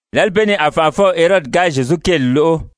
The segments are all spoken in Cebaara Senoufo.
Lǎli bee ni a fànʔafɔw Herodi ga Zyezu kéeli lóʔo,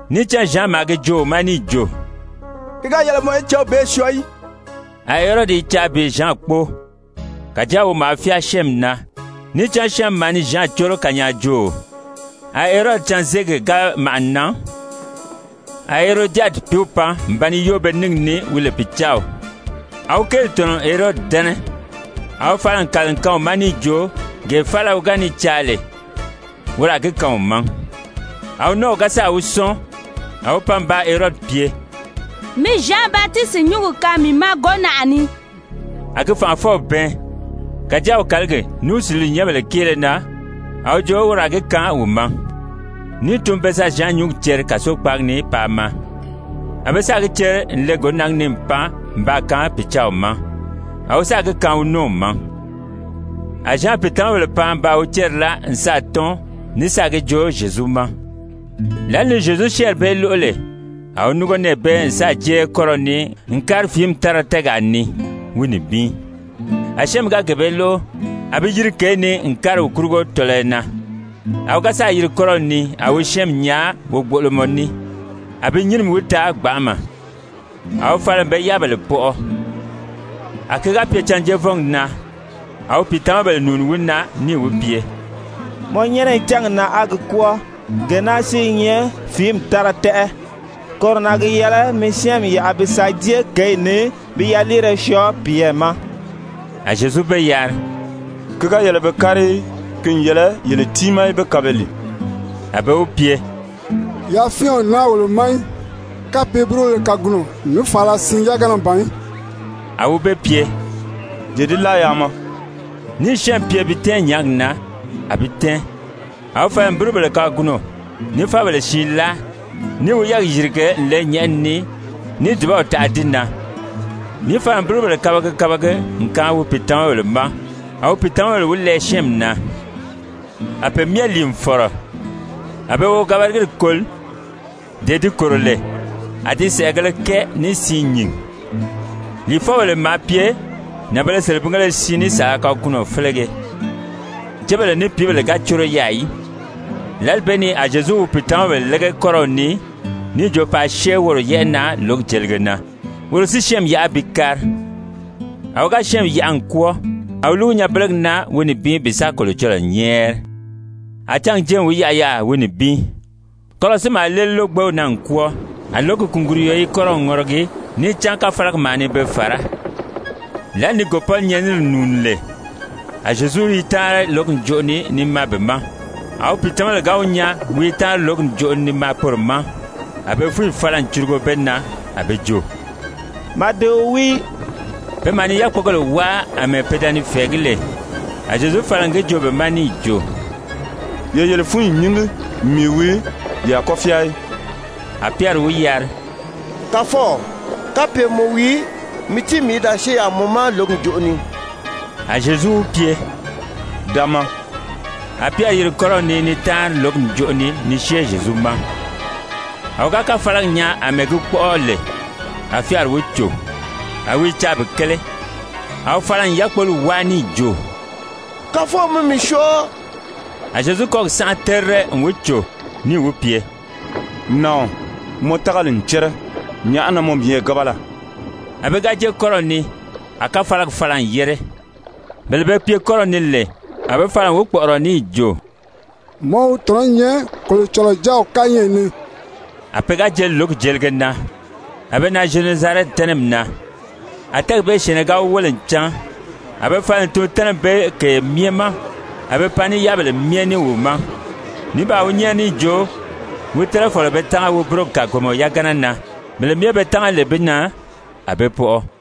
Níì cán Zyan maa gi joo wi ma níì jo: «Ki ga yɛlɛ mɔ í céw bee syɔɔ í.» A Herodi i caa bi Zyan kpóo. Kàjáa wi maa fyáa syɛ́ɛnmi na, níì cán syɛ́ɛnmi maa ni Zyan córo kanyaajooo. A Herodi canzeegi ga màʔa n nan, a Herojadi pìíw pan n ba ni yóo be níngi ni wi lè pìcaaw, a wi kéeli tɔ̀nɔ n Herodi dɛ́nɛ. A wi fala n kàli n kaan wi ma níì jo gee faala wi ga ni caa lè, woro a gi kaan wi ma. A wi nɔ́ɔw ga sáà wi sɔ́ɔn, a wi pan n baa Herodi pye: «Mi Zyan Batisiti nyúngi kaan mii ma gǒnaʔa ni.» A gi fànʔafɔw bɛɛn, kàjáa wi kàligi ní wi suliinyɛnbèle kéele na, a wi jo woro a gi kaan wi ma. Níì tun be sa Zyan nyúngi ceri kàsokpaagi ni paa maa. A be sáà gi ceri n le gǒnaagi ni n pan n baa kaan pìcaaw ma. A wi sáà gi kaan wi nɔ́ɔw ma. A Zyan pìitamabèle pan n baa wi céri láa n sáà tɔ́n ní sáà gi joo Zyezu ma. Lǎli ni Zyezu syɛ́ɛnri bee lóʔo lè, a wi núngo nɛɛ bee n sáà jée kɔ́rɔw ni n kári fìími tára tɛ́ɛgaa ni, wi nibin. A syɛ́ɛnmi ga gee bee lóʔo, a bi yiri kěyi ni n kári wi kurugo tɔlɔyɔ na. A wi ga sáà yiri kɔ́rɔw ni a wi syɛ́ɛnmi nyaa wogboʔolomɔ ní. A bi nyínimi wi taa gbanʔama. A wi fala n be yáabèle pɔʔɔ. A ki ga pye cânjeevɔngi na, a wi pìitamabèle nùuni wi na níì wi pye: «Mɔ nyɛ́nɛ i cángi na, á gi kwɔ́ɔ. Gee naa si i nyɛ fìími tára tɛ́ʔɛ. Koro na gi yɛlɛ mɔ í syɛ́ɛnmi yaʔa bi sa jée kěyi ni bi yaliire syɔɔ piyɛɛ ma.» A Zyezu be yari: «Ki ga yɛlɛ be kári í. Ki n yɛlɛ yele tiimaa í be kaan be lìi.» A be wi pye: «Yafyɛn o naa wolo ma í kapye búrubéle kagunɔ ní fàala siin yagana ban í.» A wi be pye: «Ye di láa yaa maa.» Níì syɛ́ɛnmi pye bi tɛ́ɛn nyàági na, a bi tɛ́ɛn, a wi fala n búrubèle kagunɔ ní fábèle siin láa, níì wi yɛ́ɛgi yìrige n le nyɛ̀ʔɛni ni níì dùbaw taʔa di na, níì fala n búrubèle kabagi kabagi n kaan wi pìitamabèle ma, a pìitamabèle wi lɛɛ syɛ́ɛnmi na. A pe myɛ lìi n fɔ̀rɔ. A be wogabagiri koli, dee di kòro lè, a di sɛ̀ʔɛgēle kɛɛ ní siin nyìn. Lìifɔbèle maa pye nànbēle selebingéle siin ní saala kagunɔ felege. Cébèle ní pìíbèle ga córo yaà í. Lǎli bee ni a Zyezu wi pìitamabèle lége kɔ́rɔw ni níì jo paa syée woro yɛ́ʔɛ na lǒgi jelige na, woro si syɛ́ɛnmi yaʔa bi kári. A wi ga syɛ́ɛnmi yaʔa n kwɔ́ɔ, a wi lúgu nyanbelegi na wi nibin bi sa Kolocɔlɔɔ nyɛ́ɛri. A cángi jée n wi yaʔa yaà wi nibin. Kɔ́rɔw si maa léeli lógbew na n kwɔ́ɔ, a lǒgi kùnguruyo i kɔ́rɔw ŋɔrɔgi, níì cán káfalagi maa ni be fàrá. Lǎli ni gòpɔ́nyɛnini nùuni lè, a Zyezu i táanri lǒgi ǹjoʔo ni ni maa be ma. A wi pìitamabèle ga wi nyaa wi i táanri lǒgi ǹjoʔo ni ni maa poro ma, a be fúnyi fala n curugo be na. A be jo: «Màdeo wii!» Pe maa ni yákpogèle wáa àmɛɛ pe da ni fɛ̀ɛgí lè. A Zyezu fala n gi joo be ma níì jo: «Ye yele fúnyi nyíngi, mii wii, ye a kɔ́ fyáa í!» A Pyɛri wi yari: «Kàfɔw, kapye mɔ wii, mi tíi mii í da syée yaà mɔ ma lǒgi ǹjoʔo ni.» A Zyezu wi pye: «Da maa!» A Pyɛri yiri kɔ́rɔw ni ni táanri lǒgi ǹjoʔo ni ni syée Zyezu ma. A wi ga káfalagi nyaa àmɛɛ gi kpɔ́ʔɔ lè, a fyáari wi cò. A wi i caa bi kéle. A wi fala n yákpoli wáa níì jo: «Kàfɔw, mi mii syɔɔ!» A Zyezu kɔ́gi sánʔa terire n wi cò, níì wi pye: «Nàɔn, mɔ tágali n cɛ́rɛ, nyàʔá na mɔ miyɛɛ gábala?» A be ga jée kɔ́rɔw ni, a káfalagi fala n yére. Bele be pye kɔ́rɔw ni lè, a be fala n wi kpɔ̀ʔɔrɔ níì jo: «Mɔ wi tɔ̀nɔ́ nyɛ Kolocɔlɔɔ Jáaw kányɛʔɛ ni.» A pe ga jeli lǒgi jelige na, a be nan Zyenezarɛti tɛ́nɛmi na. A tɛ́ɛgi bee syɛ̀ɛnnɛ ga wi wéle n cán, a be fala n tun tɛ́nɛmi bee kèye myɛ ma, a be pan ní yáabèle myɛ ní wi ma. Ní baa wi nyɛ́ɛri níì jo wi tɛ́nɛ fɔ̀lɔ be tánga wi búrogi kàgomɔ yagana na. Bele myɛ be tánga lè bi na, a be pɔʔɔ.